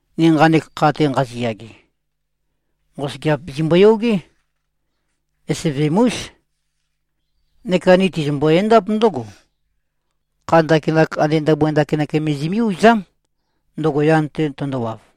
Ni nqanek kha-te nqaziyage, nqosøgeap zimboyogé. Esevem-ús. Neka ni tizimbo-endáp ndǿgo: Kha ndakinak ande ndabua ndakinak me zimí-uzám, ndøgo yan-te tøndowav.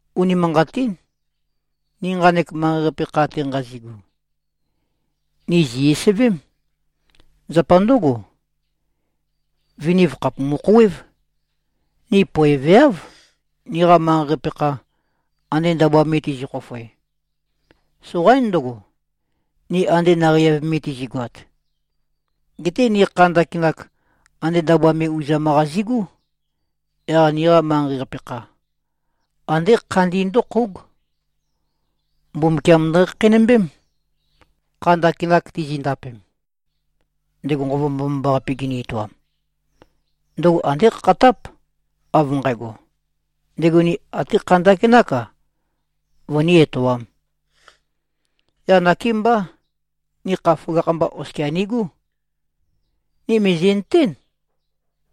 Unimanqatín. Ni nqanek manqei-qape kha-te nqazigu, ni zì-esevém. Zapa ndǿgo, viniv khàpumu-khouwév. Ni poeveáv, niqa manqei-qape kha, ande ndabua me tizi꞉-khofoe. Soqaín ndøgo, ni ande naqei-av me tizi꞉goat. Geté ni kha ndakinak, ande ndabua me uzam-qa zi꞉gú. Yaq niqa manqei-qape kha, andé khandi ndǿkhóug. Mbumbukiam ndøkhakheinømbém, kha ndakinak tizindapem. Ndego Nqova Mbomambaqape gini-etoam, ndøgo andé khakhatáp, av nqægo, ndego ni até kha ndakinák-a, vøní-etoām. Yaq nakémbá, ni kha føgakh-mba oskia nigú. Ni mìzi꞉nøtén,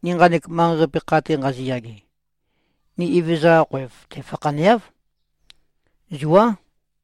ni nqanek manqei-qape kha-te nqaziyage, ni Evezøza-qa khoev-te fakhaneáv. Zuá.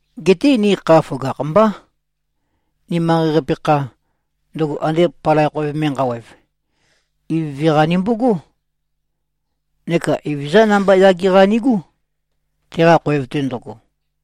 Geté ni kha føgakh-mbá. Ni manqei-qape kha, ndøgo ande palai khoev me nqawev, ivøve-qa nimbogó, neka Evezøzá namba yage-qa nigú, teqa khoev-te ndøgo.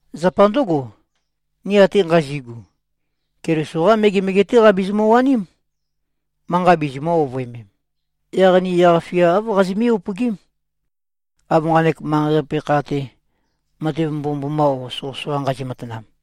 Zapa ndǿgo, ni ate nqazi꞉gu, Keliso-qá megemege-té qabizimø-waním, manqa bizimø̄-ovøemem. Yaq ni yaq-fia āv qazimí-upøgím, av nqanek manqei-qape kha-te, matev mbomømboma o soqøsoqa nqazi꞉-matanam.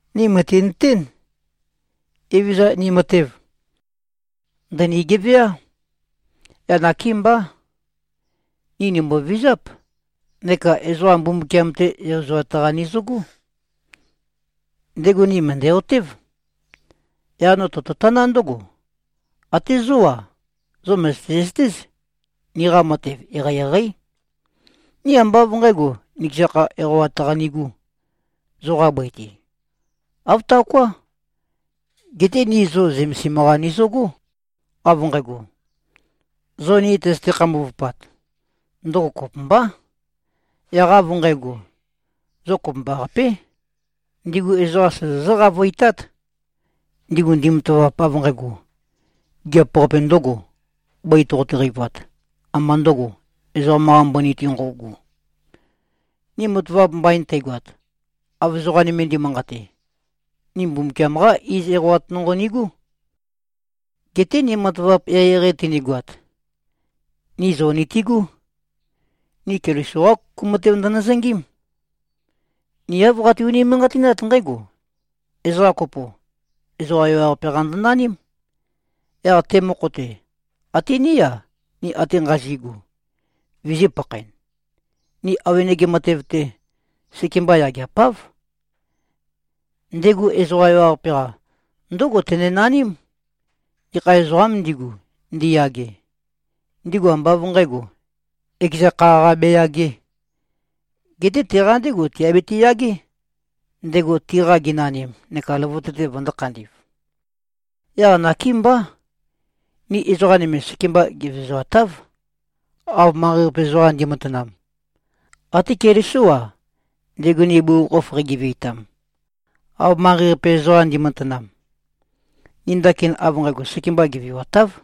Ni mø̀tinøtén, Evezøza ni matev, ndø̀ni-geveá. Yaq nakémbá, ni nìmbovizáp, neka ezoqa Mbumbukiam-te yozoat-qa nizøgó. Ndego ni mø̀ndæ-otév. Yaq no tototaná ndǿgo: Até zó-a, zo mø̀zøte-zøtéz, niqa matev eqeieqeí. Ni ambá av nqǣgo, nikeza kha eqawat-qa nigū, zoqa bøi-te. Āv taoká. Geté ni zo zømesim-qa nizøgó, av nqægo, zo ni tøzøte-khambuvupat, ndøgo kopømbá. Yaq av nqægo, zo kopømbaqapé, ndigu ezoqam sozozǿ-qavøitát, ndigu ndimatavap av nqægo, gigiap-qape ndø̄go, bøi toqote-qeivat, ambā ndøgo, ezoqam-qa mbøni-te nqøugu. Ni matavap mbain teigoat, av ezoqa nøme ndi꞉manqate, ni Mbumbukiam-qá iz eqawat nonqo nigú. Geté ni matavap eqeieqei tønigoat, ni zo nitigú. Ni Keliso-qá kuku matev ndønøzøngím. Ni āv qati-unimanqatinát nqǽgo: Ezoqa kopo, ezoqa ewaqape-qa ndønaním. Yaq te mokho-te, até ní-a, ni ate nqazi꞉gu, vizī-pakhaen. Ni awenege matev-te, sekemba yageapáv. Ndego ezoqa ewaqape-qa, ndǿgo tenenaním: Gekha ezoqām ndigu, ndiyage, ndigu ambá av nqǣgo, ekeza kha-qa beyagē, geté teqa ndégo tiabiti-yagé, ndego tiqa genanim neka løvøte-te vøndō-khandi꞉v. Yaq nakémbá. Ni ezoqa nøme sekemba gevezoatáv, av manqei-qape ezoqam ndi꞉matanam. Até Kelisó-a, ndego ni bugukhokhof qeigeveitam, av manqei-qape ezoqam ndi꞉matanam, ni ndakin av nqægo sekemba geveuatáv.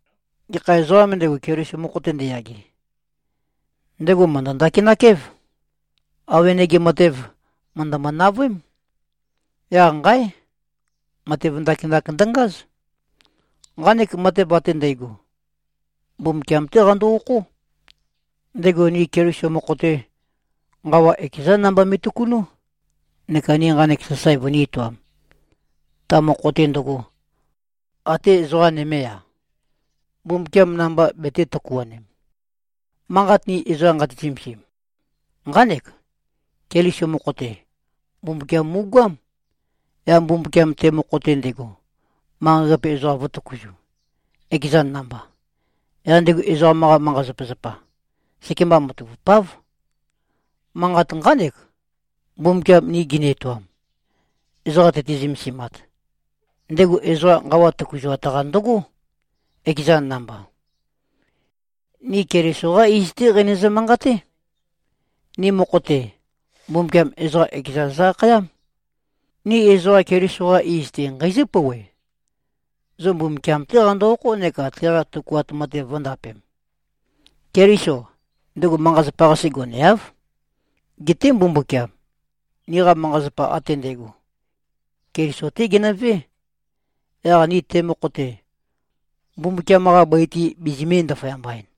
Gekha ezoqām ndego, Keliso mokho-te ndeyage, ndego mø̀ndø-ndakinak-év. Awenege matev, mø̀ndømø-navøém. Yaq nqáe! Matev ndakinak ndøngáz. Nqanek matev ate ndægo, Mbumbukiam-té qando-okhó. Ndego ni Keliso mokho-te, nqawa ekezán namba me꞉tøkunú, neka ni nqanek sasae vønī-etoam, ta mokho-te ndøgo, atē ezoqa nømē-a, Mbumbukiam namba betē-tøkuanem. Manqat ni ezoqa nqati-zømesim, nqánek: Keliso mokho-te, Mbumbukiam mu꞉goám. Yaq Mbumbukiam te mokho-te ndego, manqei-qape ezoqam vø̄tøkuzu, ekezan namba. Yaq ndego ezoqam-qa manqa-zapazapa, sekemba matavupáv. Manqat nqánek, Mbumbukiam ni gini-etoam, ezoqa tøti-zømesimat. Ndego ezoqa nqawa tøkuzuat-qa ndøgó, ekezan namba. Ni Keliso-qá iz-té qeinøzø-manqaté. Ni mokho-te, Mbumbukiam ezoqa ekezan zø-akhayám. Ni ezoqa Keliso-qa iz-te nqeizǿ-pouwe: Zo Mbumbukiam-té qando-okhó neka teqa tøkuat matev vø̄ndapem. Keliso, ndego manqa-zapa-qase goneáv. Geté Mbumbukiam, niqa manqa-zapa ate ndægo, Keliso-té geno꞉vé, yaq ni te mokho-te, Mbumbukiam-qa bøi-te bizimī-ndaføyamba-en.